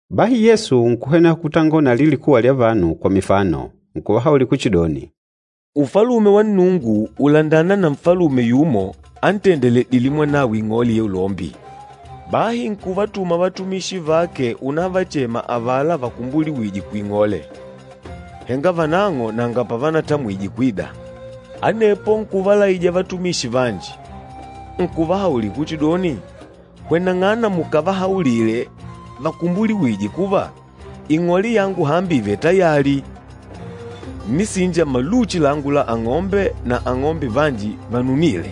Bahi Yesu nkuhweneha kutangola na alila likuwa lya vanu kwa mifano. Nkuvahaulila kuchidoni, “Ufalume wa Nnungu ùlandana na nfalume yumo antendeledîle mwanawe ing'ole ya ulombi. Bahi nkuvatuma vatumishi vake unavachema avala vakumbuliwîje kuing'ole, henga vanang'o nanga pavanatamwije kwida. Anepo nkuvalaija vatumishi vanji, nkuvahaulila kuchidoni, ‘Hweneng'ana mukavahaulile vakumbuliwîje kuva, ing'ole yangu hambi ìvele tayali. Ǹnisinja maluchi langu la ang'ombe na ang'ombe vanji vanunîle,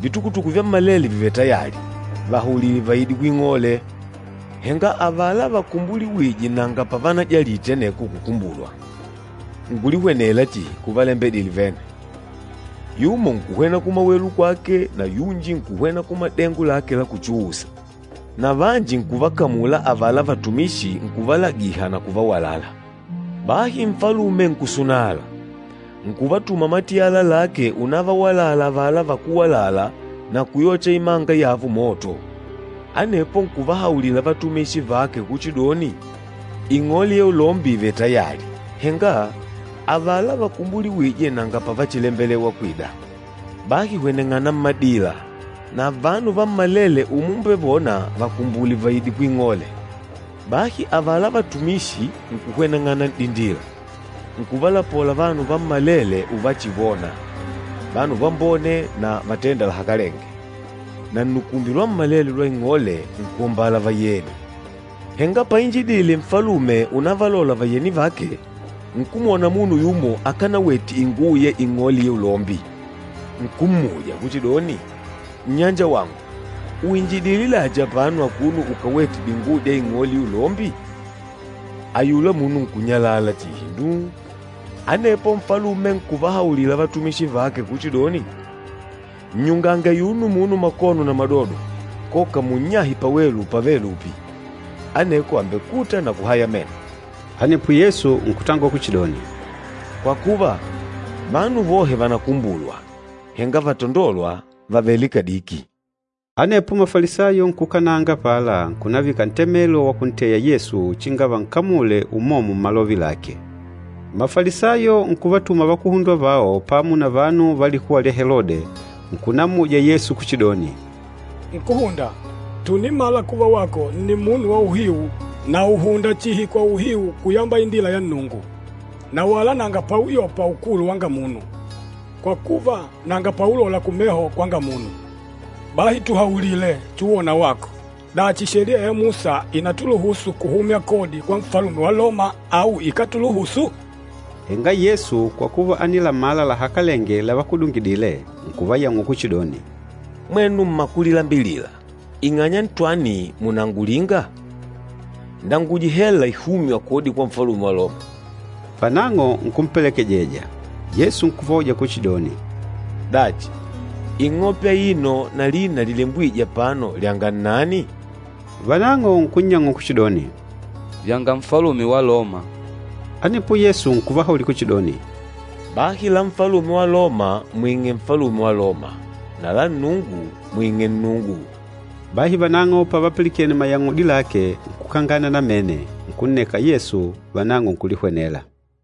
vitukutuku vyammalele vìvele tayali. Vahaulile vaide kuing'ole!’ Henga avala vakumbuliwîje nanga pavanajalite aneko kukumbulwa, nkulihwenela chihi kuvalembedile vene, yumo nkuhwena kumawelu kwake na yunji nkuhwena kumadengo lake la kuchuusa. Na vanji nkuvakamula avala vatumishi nkuvalagiha na kuvawalala. Bahi nfalume nkusunala. Nkuvatuma matiyala lake unavawalala avala vakúwalala na kuyocha imanga yavo moto. Anepo nkuvahaulila vatumishi vake kuchidoni, ‘Ing'ole ya ulombi ìvele tayali, henga avala vakumbuliwîje nanga pavachilembelewa kwida. Bahi hweneng'ana mmadila, na vanu vammalele umumbevona vakumbule vaide kuing'ole.’ Bahi avala vatumishi nkuhweneng'ana n'dindila, nkuvalapola vanu vammalele uvachivona, vanu vambone na vatênda lahakalenge, na nnukumbi lwammalele lwa ing'ole nkuombala vayeni. Henga painjidile nfalume unavalola vayeni vake, nkumwona munu yumo akanawete inguwo ya ing'ole ya ulombi. Nkummuja kuchidoni, ‘Nnyanjawangu, uinjidile dachi apano akuno ukawètè dinguwo dya ing'ole ya ulombi?’ Ayula munu nkunyalala chihi nduu. Anepo nfalume nkuvahaulila vatumishi vake kuchidoni, ‘Nnyungange ayuno munu makono na madodo, koka munnyahe pawelu pavêle lupi. Aneko àmbekuta na kuhaya meno.’” Anepo Yesu nkutangola kuchidoni, “Kwa kuva, vanu vohe vànakumbulwa, henga vatandôlwa vavêle kadiki.” Anepo Mafalisayo nkuukananga apala nkunavika ntemelo wa kunteya Yesu uchinga vankamule umomo mmalove lake. Mafalisayo nkuvatuma vakuhundwa vao pamo na vanu va likuwa lya Helode, nkunammuja Yesu kuchidoni, “Nkúhunda, tùnimala kuva wako nni munu wa uhiu na ùhunda chihi kwa uhiu kuyamba indila ya Nnungu. Na wala nanga pauyopa ukulu wanga munu, kwa kuva, nanga paulola kumeho kwanga munu. Bahi tuhaulile, chuwona wako, dachi Sheliya ya Musa ìnatuluhusu kuhumya kodi kwa Nfalume wa Loma au ikátuluhusu?” Henga Yesu kwa kuva ánilamala lahakalenge lavakudungidile, nkuvayang'ula kuchidoni, “Mwenu mmakulilambilila, ing'anya ntwani mùnangulinga? Ndanguje hela ihûmywa kodi kwa Nfalume wa Loma.” Vanang'o nkumpelekejeja. Yesu nkuvauja kuchidoni, “Dachi, ing'ope aino na lina lilembwîje apano lyanga nnani?” Vanang'o nkunnyang'ula kuchidoni, “Vyanga Nfalume wa Loma.” Anepo Yesu nkuvahaulila kuchidoni, “Bahi la Nfalume wa Loma mwing'e Nfalume wa Loma na la Nnungu mwing'e Nnungu.” Bahi vanang'o pavapilikene mayang'udi lake, nkukangana namene, nkunneka Yesu, vanang'o nkulihwenela.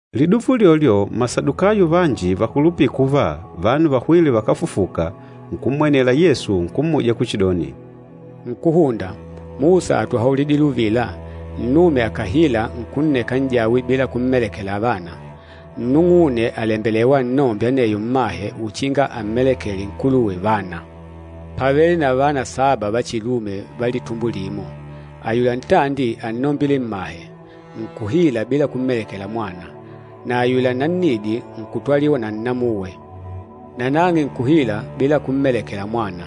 Liduva ulyolyo Masadukayo vanji vakulupîla kuva, vanu vahwîle vakáfufuka, nkummwenela Yesu nkummuja kuchidoni, “Nkúhunda, Musa átuhaulidile uvila, ‘Nnume akàhila nkunneka n'jawe bila kummelekela vana, nnung'une àlembelewa annombe aneyo mmahe uchinga ammelekele nkuluwe vana.’ Pávele na vana saba va chilume va litumbo limo. Ayula ntandi ánnombile mmahe, nkuhila bila kummeleka mwana, na ayula nannidi nkutwaliwa na nnamuwe. Nanang'e nkuhila bila kummelekela mwana,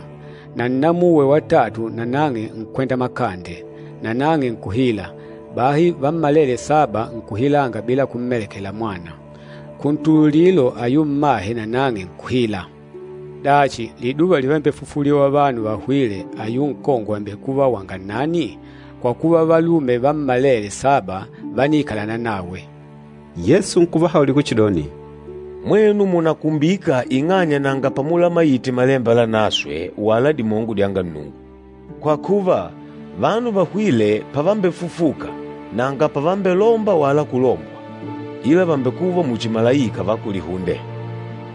na nnamuwe watatu nanang'e nkwenda makande, nanang'e nkuhila, bahi vammalele saba nkuhilanga bila kummelekela mwana. Kuntululilo ayula mmahe nanang'e nkuhila. Dachi, liduva livambefufuliwa vanu vahwîle ayula nkongwe àmbekuva wanga nnani? Kwa kuva, valume vammalele saba vániikalana nawe.” Yesu nkuvahaulila kuchidoni, “Mwenu mùnakumbika ing'anya nanga pamulamaite Malemba Lanaswe wala dimongo dyanga Nnungu. Kwa kuva, vanu vahwîle pavambefufuka, nanga pavambelomba wala kulombwa, ila vàmbekuva muchi malaika va kulihunde.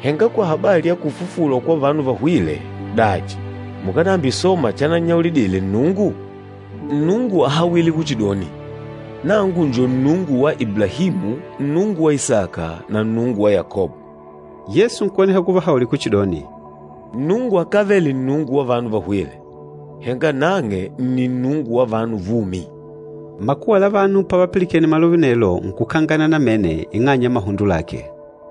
Henga kwa habali ya kufufulwa kwa vanu vahwîle, dachi mukánambisoma chanannyaulidile Nnungu? Nnungu áhawile kuchidoni, ‘Nangu njo Nnungu wa Iblahimu, Nnungu wa Isaka, na Nnungu wa Yakobo.’” Yesu nkuhweneha kuvahaulila kuchidoni, “Nnungu akávele Nnungu wa vanu vahwîle, henga nang'e nni Nnungu wa vanu vumi.” Makuwa la vanu pavapilikene malove anelo, nkukangana namene ing'anya ya mahundo lake.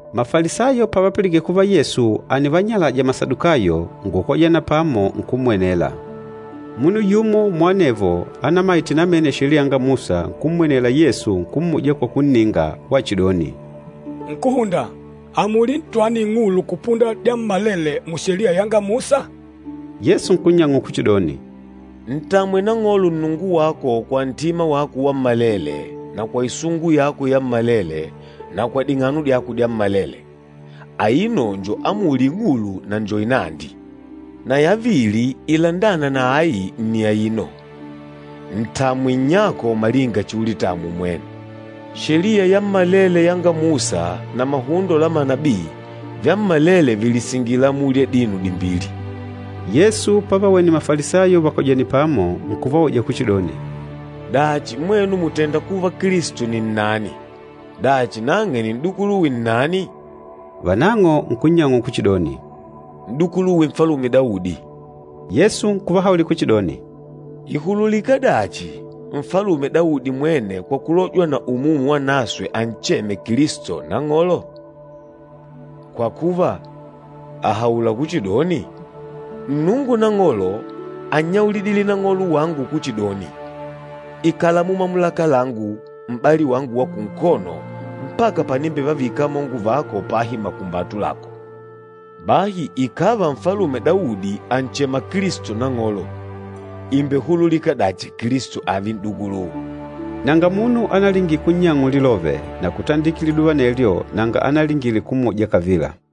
Mafalisayo pavapilikene kuva Yesu ánivanyalaja Masadukayo, nkukojana pamo nkummwenela. Munu yumo muanevo ánaimaite namene Sheliya yanga Musa nkummwenela Yesu nkummuja kwa kunninga, wachidoni, “Nkúhunda, amuli ntwani ing'ulu kupunda dyammalele mu Sheliya yanga Musa?” Yesu nkunnyang'ula kuchidoni, “‘Ntamwe Nang'olo Nnungu wako kwa ntima wako wammalele na kwa isungu yako yammalele na kwa ding'ano dyako dyammalele.’ Aino njo amuli ing'ulu na njo inandi. Na yavili ilandâna na ai nni aino, ‘Ntamwe nnyako malinga chiulitamwa umwene.’ Sheliya yammalele yanga Musa na mahundo la manabii, vyammalele vìlisingila amuli adino dimbili.” Yesu pavawene Mafalisayo vakojènè pamo, nkuvauja kuchidoni, “Dachi mwenu mùtenda kuva Kilisto ni nnani? Dachi, nang'e nni n'dukuluwe nnani?” Vanang'o nkunnyang'ula kuchidoni, “N'dukuluwe Nfalume Daudi.” Yesu nkuvahaulila kuchidoni, “Ìhululika dachi, Nfalume Daudi mwene kwa kulojwa na Umumu Wanaswe ancheme Kilisto, Nang'olo? Kwa kuva, àhaula kuchidoni, ‘Nnungu Nang'olo ánnyaulidile Nang'olo wangu kuchidoni, Ikala mumamulaka langu, m'bali wangu wa kunkono, mpaka panimbevavika amongo vako pahi makumbatu lako.’ Bahi ikàva Nfalume Daudi ànchema Kilisto ‘Nang'olo,’ ìmbehululika dachi Kilisto ààve n'dukuluwe?” Nanga munu analingile kunnyang'ula lilove, na kutandikila liduva anelyo nanga analingile kummuja kavila.